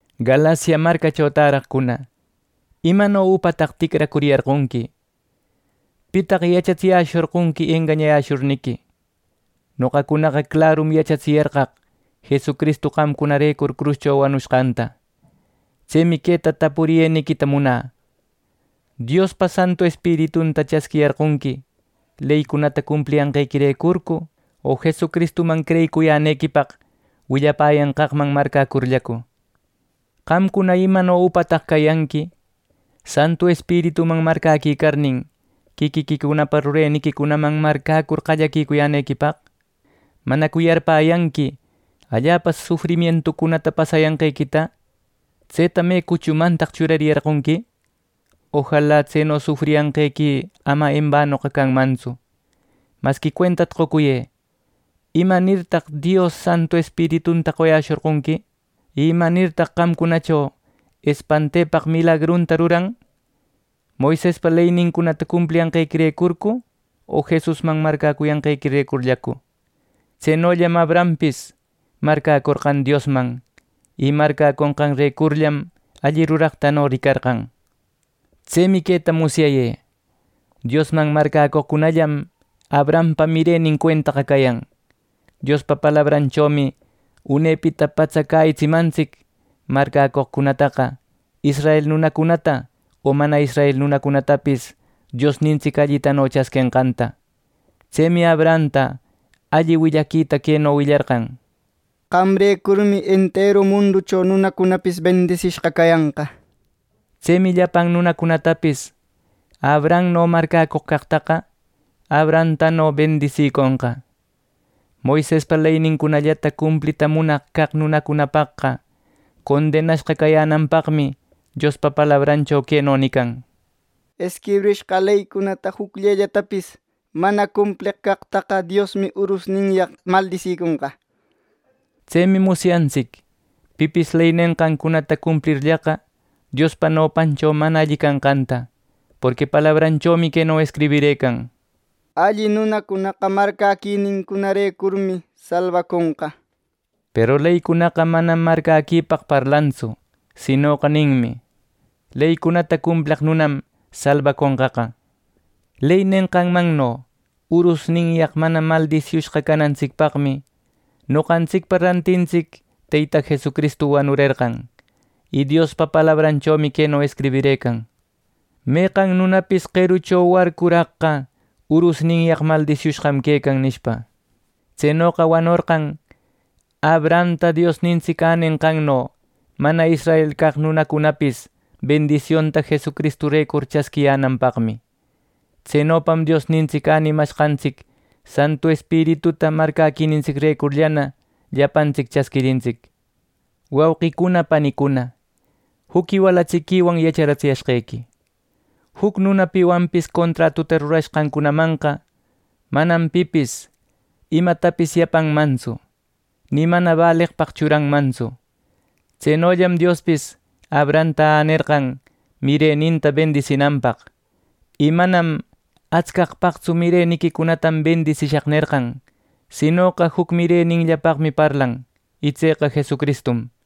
Galacia marcacho täraqcuna, ¡Imano upataq ticracuriyarqonqui! ¿Pitaq yachatsiyäshorqonqui engañayäshurniqui? Noqacunaqa clarum yachatsiyarqaq Jesucristu qamcunarecur cruscho wanushqanta. Tsemi queta tapuriyeniquita munä: ¿Diospa Santu Espiritunta chasquiyarqonqui leycunata cumpliyanqequirecurcu, o Jesucristuman creyicuyänequipaq willapäyanqaqman marcäcurllacu! ¡Qamcuna imano upataq cayanqui! ¡Santu Espirituman marcäquicarnin, quiquiquicunapa rureniquicunaman marcäcur qallaquicuyänequipaq! ¿Manacu yarpäyanqui allapa sufrimientucunata pasayanqequita! ¿Tseta me cuchumantaq churariyarqonqui! ¡Ojala tseno sufriyanqequi ama embanoqa canmantsu! ¡Masqui cuentata qocuyë! ¿Imanirtaq Dios Santu Espiritunta qoyäshorqonqui? ¿Y imanirtaq qamcunacho espantepaq milagrunta ruran: Moisespa leynincunata cumpliyanqequirecurcu o Jesusman marcäcuyanqequirecurllacu? Tsenollam “Abrahampis marcäcorqan Diosman, y marcäconqarecurllam alli ruraqtano ricarqan.” Tsemi queta musyayë: Diosman marcäcoqcunallam Abrahampa mirenin cuentaqa cayan. Diospa palabranchomi unepita patsa cäyitsimantsic marcäcoqcunataqa israel nunacunata o mana israel nunacunatapis Diosnintsic allitano chasquenqanta. Tsemi Abrahamta alli willaquita queno willarqan: “Qamrecurmi enteru munducho nunacunapis bendisishqa cayanqa” nir. Tsemi llapan nunacunatapis Abrahamno marcäcoq caqtaqa Abrahamtano bendisiconqa. Moisespa leynincunallata cumplita munaq caq nunacunapaqqa condenashqa cayänanpaqmi Diospa palabrancho queno nican: “Escribishqa leycunata jucllellatapis mana cumpleq caqtaqa; Diosmi urusninyaq maldisiconqa” nir. Tsemi musyantsic pipis ley nenqancunata cumplirllaqa Diospa nopancho mana alli canqanta. Porqui palabranchomi queno escribirëcan: “Alli nunacunaqa marcäquininrecurmi salbaconqa” nir. Peru leycunaqa manam marcäquipaq parlantsu; sinoqa “Leycunata cumpleq nunam salbaconqaqa” ninmi. Ley nenqanmanno urusnintsicyaq mana maldisiushqa canantsicpaqmi noqantsicpa rantintsic Teyta Jesucristu wanurerqan. Y Diospa palabranchomi queno escribirëcan: “Meqan nunapis qerucho warcuraqqa urusninyaq maldisiushqam quecan” nishpa. Tsenoqa wanorqan Abrahamta Diosnintsic änenqanno mana israel caq nunacunapis bendisionta Jesucristurecur chasquiyänanpaqmi. Tsenopam Diosnintsic änimashqantsic Santu Espirituta marcäquinintsicrecurllana llapantsic chasquirintsic. Wauqicuna panicuna, juc iwalatsiquiwan yacharatsiyashqequi: Juc nuna piwanpis contratuta ruracushqanmanqa, manam pipis imatapis yapanmantsu, ni mana baleqpaq churanmantsu. Tsenollam Diospis Abrahamta änerqan mireninta bendisinanpaq. Y manam atscaqpaqtsu “Mireniquicunatam bendisishaq” nerqan, sinoqa juc mireninllapaqmi parlan, y tseqa Jesucristum.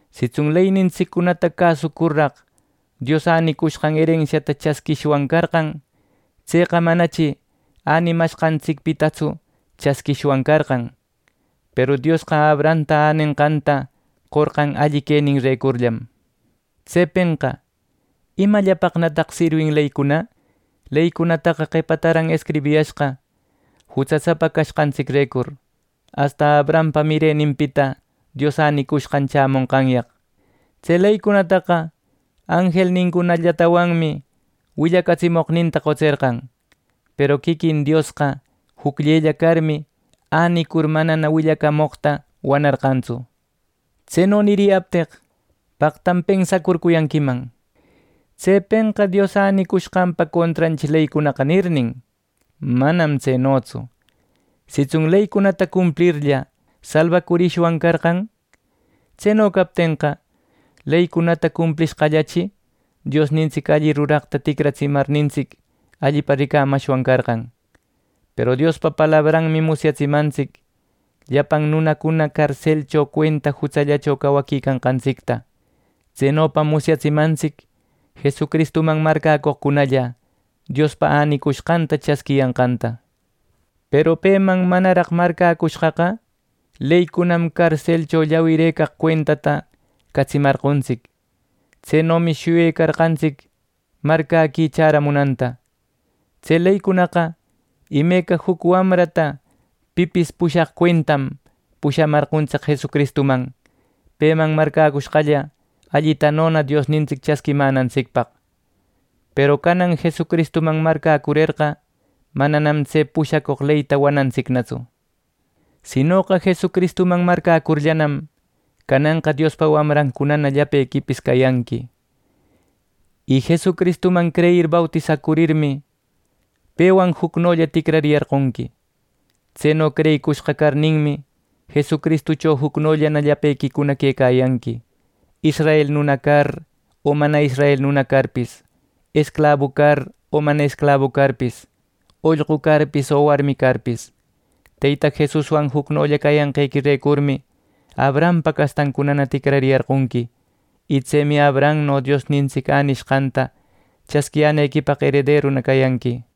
Sitsun leynintsiccunata cäsucurraq Dios änicushqan erensiata chasquishwan carqan, tseqa manachi änimashqantsicpitatsu chasquishwan carqan. Peru Diosqa Abrahamta änenqanta qorqan alli queninrecurllam. Tsepenqa ¿Imallapaqnataq sirwin leycuna? Leycunataqa qepataran escribiyashqa jutsasapa canqantsicrecur, asta Abrahampa mireninpita Dios änicushqan chämonqanyaq. Tse leycunataqa anjelnincunallatawanmi willacamoqninta qotserqan. Peru quiquin Diosqa jucllella carmi, änicur manana willacamoqta wanarqantsu. Tseno niriyapteq paqtam pensacurcuyanquiman: “¿Tsepenqa Dios änicushqanpa contranchi leycunaqa?” nirnin. ¡Manam tsenotsu! Sitsun leycunata cumplirlla, salbacurishwan carqan; tseno captenqa, leycunata cumplishqallachi Diosnintsic alli ruraqta ticratsimarnintsic allipa ricamashwan carqan. Peru Diospa palabranmi musyatsimantsic llapan nunacuna carselcho cuenta jutsallacho cawaquicanqantsicta. Tsenopam musyatsimantsic Jesucristuman marcäcoqcunalla Diospa änicushqanta chasquiyanqanta. Peru peman manaraq marcäcushqaqa, leycunam carselcho llawiraq cuentata catsimarqontsic. Tsenomi shuyecarqantsic marcäqui chäramunanta. Tse leycunaqa, imeca juc wamrata pipis pushaq cuentam, pushamarqontsic Jesucristuman, peman marcäcushqalla allitanona Diosnintsic chasquimänantsicpaq. Peru canan Jesucristuman marcäcurerqa, mananam tse pushacoq leyta wanantsicnatsu. Sinoqa Jesucristuman marcäcurllanam, cananqa Diospa wamrancunana llapequipis cayanqui. Y Jesucristuman creyir bautisacurirmi, pewan jucnolla ticrariyarqonqui. Tseno creyicushqa carninmi, Jesucristucho jucnollana llapequicuna quecayanqui, israel nuna car o mana israel nuna carpis, esclabu car o mana esclabu carpis, ollqu carpis o warmi carpis. Teyta Jesuswan jucnolla cayanqequirecurmi, Abrahampa castancunana ticrariyarqonqui. Y tsemi Abrahamno Diosnintsic änishqanta chasquiyänequipaq erederuna cayanqui.